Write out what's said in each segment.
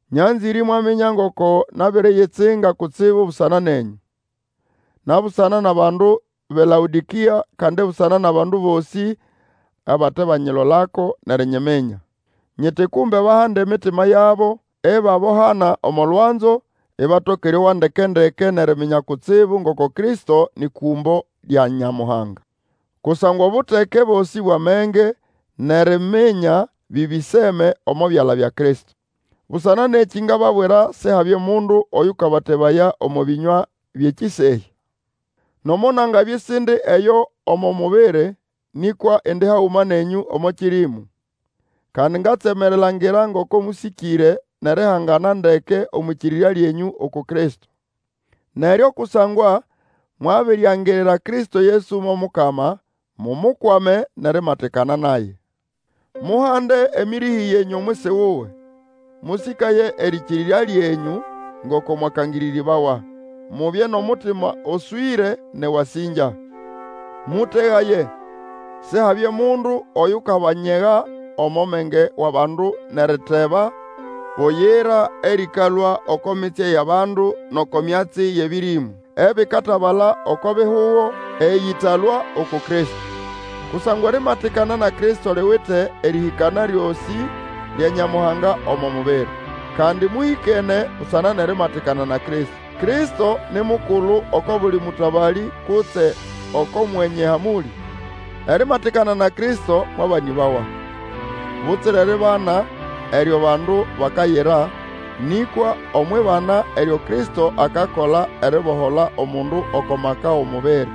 Nyanzĩre imwaminya ngoko nabiriyitsinga kutsibu busana nenyũ, na busana nʼabandu bʼeLaodĩkĩa, kandi busana nʼabandu bosĩ abatebanyilolako nʼerinyiminya. Nyiti kumbe bahande emitima yabo, ibabohana omo lwanzo, ibatoka erĩowa ndeke-ndeke nʼeriminya kutsibu ngoko Kristo nĩ kũmbo lya Nyamuhanga. Kusangwa obuteke bosĩ bwʼamenge, nʼeriminya bĩbĩseme omo byala bya Kristo. Busana nʼekĩ ngababwira Sihabye omundu oyũkabatebaya omo bĩnywa byʼekĩsehya. Nomo nangabya isindi eyo omo mubiri, nĩkwa indi haguma nenyũ omo kĩrĩmu, kandi ngatsema erilangira ngoko mũsĩkĩre nʼerihangana ndeke omwʼĩkĩrĩrya lyenyũ uku Kristo. Neryo, kusangwa mwabiriangirira Kristo Yesu mo Mukama, mumukwame nʼerimatikana naye. Muhande emĩrĩhĩ yenyũ omwisi wuwe. Mũsĩkaye erĩkĩrĩrya lyenyũ ngoko mwakangĩrĩrĩbawa. Mubye nʼomutima oswĩre nʼewasĩngya. Mũtegaye, Sihabye mundu oyukabanyega omo menge wʼabandu nʼeriteba buyira erĩkalũa oko mitsye yʼabandu, nʼoko myatsi yʼebĩrĩmũ ebikatabala oko bihugo, eyĩtalũa uku Kristo. Kusangwa erimatikana na Kristo liwite erĩhĩkana lyosĩ lya Nyamuhanga omo mubiri. Kandi mũhĩkene busana nʼerimatikana na Kristo. Kristo ni mukulu oko buli mũtabalĩ kutse oko mwenye hamũlĩ. Erimatikana na Kristo mwabanĩbawa, butsira eribana eryo bandu bakayira, nĩkwa omwʼibana eryo Kristo akakola eribohola omundu oko maka wʼomubiri.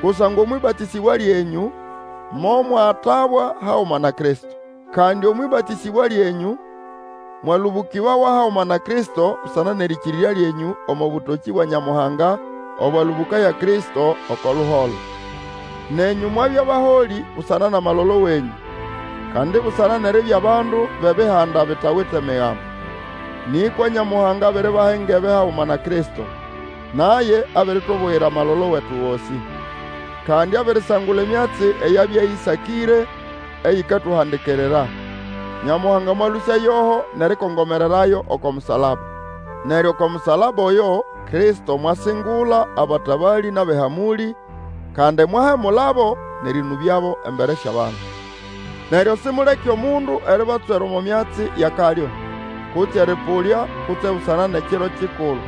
Kusangwa omwʼĩbatĩsĩbwa lyenyũ momwatabwa haguma na Kristo. Kandi omwʼĩbatĩsĩbwa lyenyũ, mwalũbũkĩbawa haguma na Kristo busana nʼerĩkĩrĩrya lyenyũ omo bũtokĩ bwa Nyamuhanga, obwalũbũkaya Kristo oko luholo. Nenyũ mwabya baholĩ busana nʼamalolo wenyũ, kandi busana nʼeribya bandu bʼEbihanda bitawite Migambo. Nĩkwa Nyamuhanga abiribaha engebe haguma na Kristo. Naye abiritubuyira amalolo wetu gosĩ. Kandi abirisangula emyatsi eyabya ĩsakĩre, eyikatuhandikirira. Nyamuhanga mwalũsya yoho, nʼerikongomererayo oko musalaba. Neryo oko musalaba oyo Kristo mwasingula abatabalĩ nʼabʼehamũlĩ, kandi mwahemulabo, nʼerĩnũbyabo embere syʼabandu. Neryo simuleke omundu eribatswera omo myatsi yʼakalyo, kutse erĩpũlya, kutse busana nʼekiro kikulu,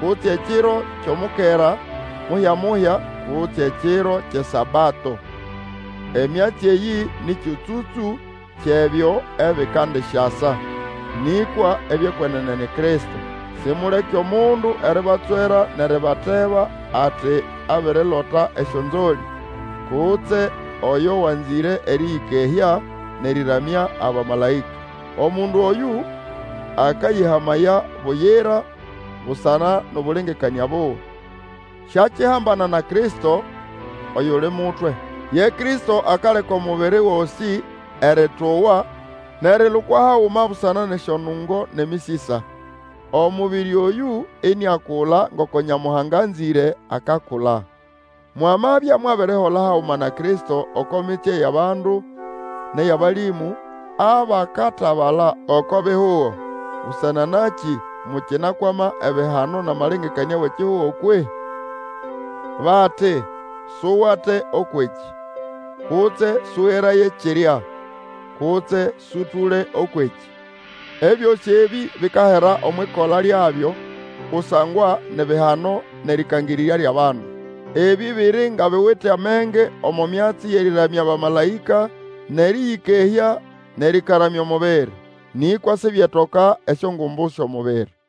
kutse ekiro kyʼomukera muhya-muhya, kutse ekiro kyʼeSabato. Emyatsi eyĩ nĩ kyũtsũtsũ kyʼebyo ebikandisyasa. Nĩkwa ebyʼekwenene ni Kristo. Simuleke omundu eribatswera nʼeribateba ati abirilota esyonzolĩ, kutse oyo wanzĩre erĩyĩkehya, nʼerĩramya abamalaĩka. Omundu oyũ akayĩhamaya buyira busana nʼobũlengekanĩa buwe. Siakihambana na Kristo, oyuli mutwe. Ye Kristo akaleka omubiri gosĩ erĩtũwa nʼerilukwa haguma busana nʼesyonungo nʼemĩsĩsa; omubiri oyũ iniakula ngoko Nyamuhanga anzĩre akakula. Mwamabya mwabirihola haguma na Kristo oko mitsye yʼabandu nʼeyʼabalĩmũ, abakatabala oko bihugo, busana nakĩ mukinakwama ebihano nʼamalengekanĩa wʼekihugo kwehĩ? Bati, Suwate Ũkwʼekĩ, kutse sũgeraye kirya, kutse sũtũle Ũkwʼekĩ. Ebyosĩ Ebĩ, bikahera omwʼikola lyabyo kusangwa ni bihano nʼerĩkangĩrĩrya byʼabandu. Ebĩ biri nga biwite amenge omo myatsi yʼerĩramya abamalaĩka, nʼerĩyĩkehya, nʼerĩkaramya omubiri. Nĩkwa sibyetoka esyongumbu syʼomubiri.